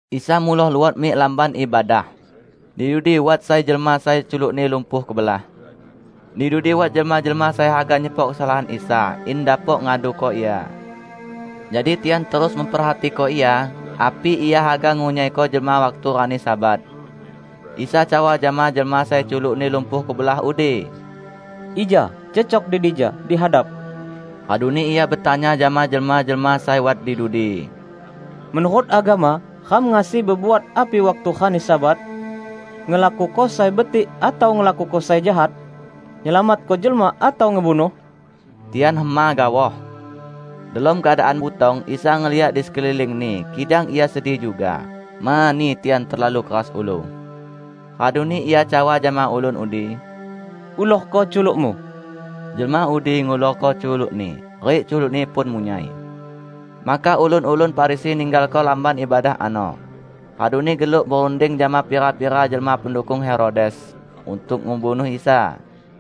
Isa muloh luot mik lamban ibadah. Di dudi wat sai jelma sai culukni lumpuh kebelah. Di dudi wat jelma-jelma sai haga nyepok kesalahan Isa, in dapok ngaduko Ia. Jadi tian terus memperhatiko Ia api Ia haga ngunyaiko jelma waktu rani Sabat. Isa cawa jama jelma sai culukni lumpuh kebelah udi, "Ija cecok di dija, di hadap." Raduni Ia betanya jama jelma-jelma sai wat di dudi, "Menurut agama, ram ngasi bebuat api waktu rani Sabat? Ngelakuko sai betik atau ngelakuko sai jahat? Nyelamatko jelma atau ngebunuh?" Tian hema gaoh. Delom keadaan butong Isa ngeliak di sekeliling-Ni, kidang Ia sedih juga, mani tian terlalu keras ulu. Raduni Ia cawa jama ulun udi, "Ulorko culukmu." Jelma udi ngulorko culukni, rik culukni pun munyai. Maka ulun-ulun Farisi ninggalko lamban ibadah ano, raduni geluk berunding jama pira-pira jelma pendukung Herodes, untuk ngebunuh Isa.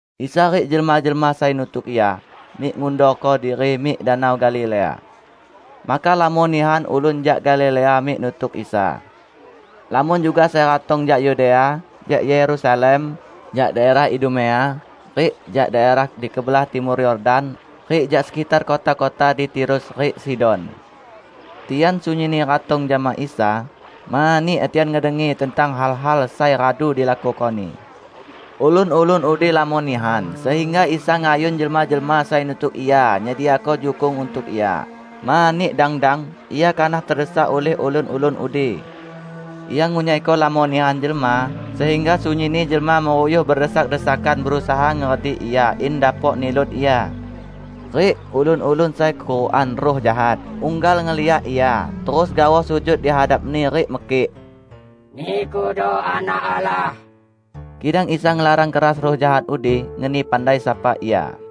Isa rik jelma-jelma sai nutuk Ia, mik ngundorko diri mik Danau Galilea. Maka lamon nihan ulun jak Galilea mik nutuk Isa. Lamon juga sai ratong jak Yudea, jak Yerusalem, jak daerah Idumea, rik jak daerah di kebelah timur Yordan, rik jak sekitar kota-kota di Tirus rik Sidon. Tian sunyinni ratong jama Isa, mani tian ngedengi tentang hal-hal sai radu dilakuko-Ni. Ulun-ulun udi lamon nihan, sehingga Isa ngayun jelma-jelma sai nutuk Ia nyediako jukung untuk Ia, mani dang-dang Ia kanah tedesak ulih ulun-ulun udi. Ia ngunyaiko lamon nihan jelma, sehingga sunyinni jelma meruyuh bedesak-desakan berusaha ngeredik Ia in dapok nilut Ia. Rik ulun-ulun sai kekurukan ruh jahat, unggal ngeliak Ia, terus gaoh sujud di hadap-Ni rik mekik, "Nikudo Anak Allah!" Kidang Isa ngelarang keras ruh jahat udi ngeni pandai sapa Ia.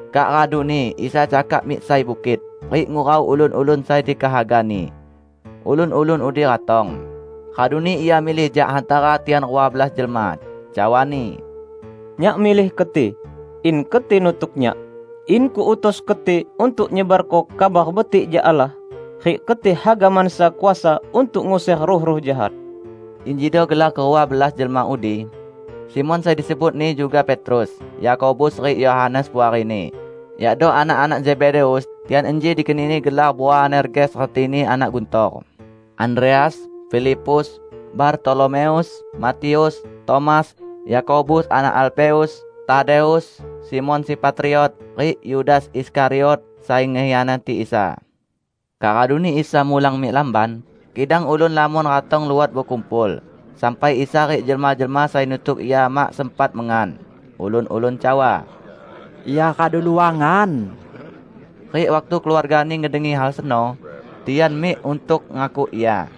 Kak raduni Isa cakak mik sai bukit, rik ngurau ulun-ulun sai dikehaga-Ni. Ulun-ulun udi ratong. Raduni Ia milih jak hantara tian rua belas jelma. Cawa-Ni, "Nyak milih keti, in keti nutuk Nyak, in Kuutus keti untuk nyebarko Kabar Betik jak Allah, rik keti haga mansa kuasa untuk nguser ruh-ruh jahat." Injido gelar kerua belas jelma udi: Simon (sai disebut-Ni juga Petrus), Yakobus rik Yohanes puarini, yakdo anak-anak Zebedeus (tian inji dikeni-Ni gelar Boanerges retini "anak guntor"), Andreas, Filipus, Bartolomeus, Matius, Tomas, Yakobus anak Alfeus, Tadeus, Simon si Patriot, rik Yudas Iskariot sai ngekhianati Isa. Kak raduni Isa mulang mik lamban. Kidang ulun lamon ratong luot bekumpul, sampai Isa rik jelma-jelma sai nutuk Ia mak sempat mengan. Ulun-ulun cawa, "Ia radu luangan!" Rik waktu keluarga-Ni ngedengi hal seno, tian mik untuk ngakuk Ia.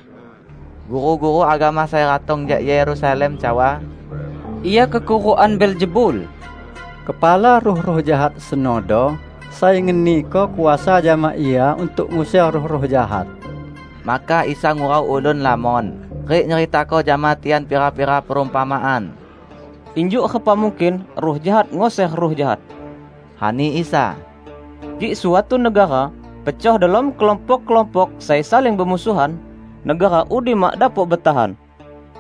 Guru-guru agama sai ratong jak Yerusalem cawa, "Ia kekurukan Beelzebul! Kepala ruh-ruh jahat senodo sai ngeniko kuasa jama Ia untuk nguser ruh-ruh jahat." Maka Isa ngurau ulun lamon, rik nyeritako jama tian pira-pira perumpamaan. "Injuk repa mungkin ruh jahat nguser ruh jahat," ani Isa. "Kik suatu negara pecoh delom kelompok-kelompok sai saling bemusuhan, negara udi mak dapok betahan.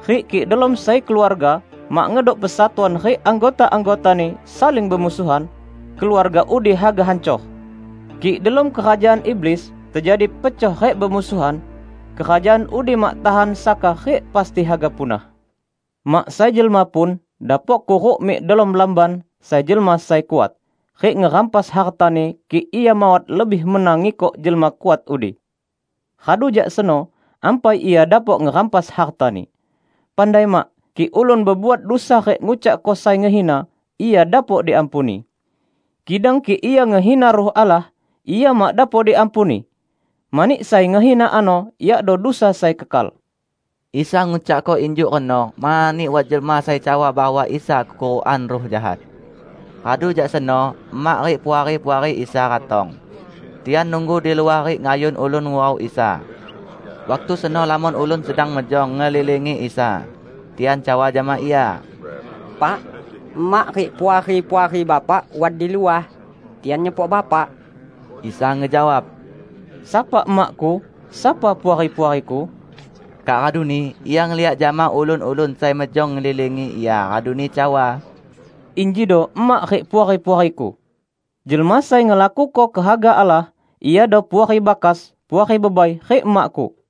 Rik kik delom sai keluarga mak ngedok persatuan rik anggota-anggotani saling bemusuhan, keluarga udi haga hancor. Kik delom kerajaan iblis tejadi pecoh rik bemusuhan, kerajaan udi mak tahan saka rik pasti haga punah. Mak sai jelma pun dapok kuruk mik delom lamban sai jelma sai kuat rik ngerampas hartani kik ia mawat lebih mena ngikok jelma kuat udi. Radu jak seno, ampai ia dapok ngerampas hartani. Pandai mak! Kik ulun bebuat dusa rik ngucakko sai ngehina, ia dapok diampuni. Kidang kik ia ngehina Ruh Allah, ia mak dapok diampuni! Mani sai ngehina ano yakdo dusa sai kekal." ( Isa ngucakko injuk reno mani wat jelma sai cawa bahwa Isa kekurukan ruh jahat.) Radu jak seno emak rik puari-puari Isa ratong. Tian nunggu di luah rik ngayun ulun ngurau Isa. Waktu seno lamon ulun sedang mejong ngelilingi Isa. Tian cawa jama Ia, "Pak, emak rik puari-puari Bapak wat di luah. Tian nyepok Bapak." Isa ngejawab, "Sapa emak-Ku? Sapa puari-puari-Ku?" Kak raduni Ia ngeliak jama ulun-ulun sai mejong ngelilingi Ia raduni cawa, "Injido emak rik puari-puari-Ku! Jelma sai ngelakuko kehaga Allah, iado puari bakas, puari bebai, rik emak-Ku."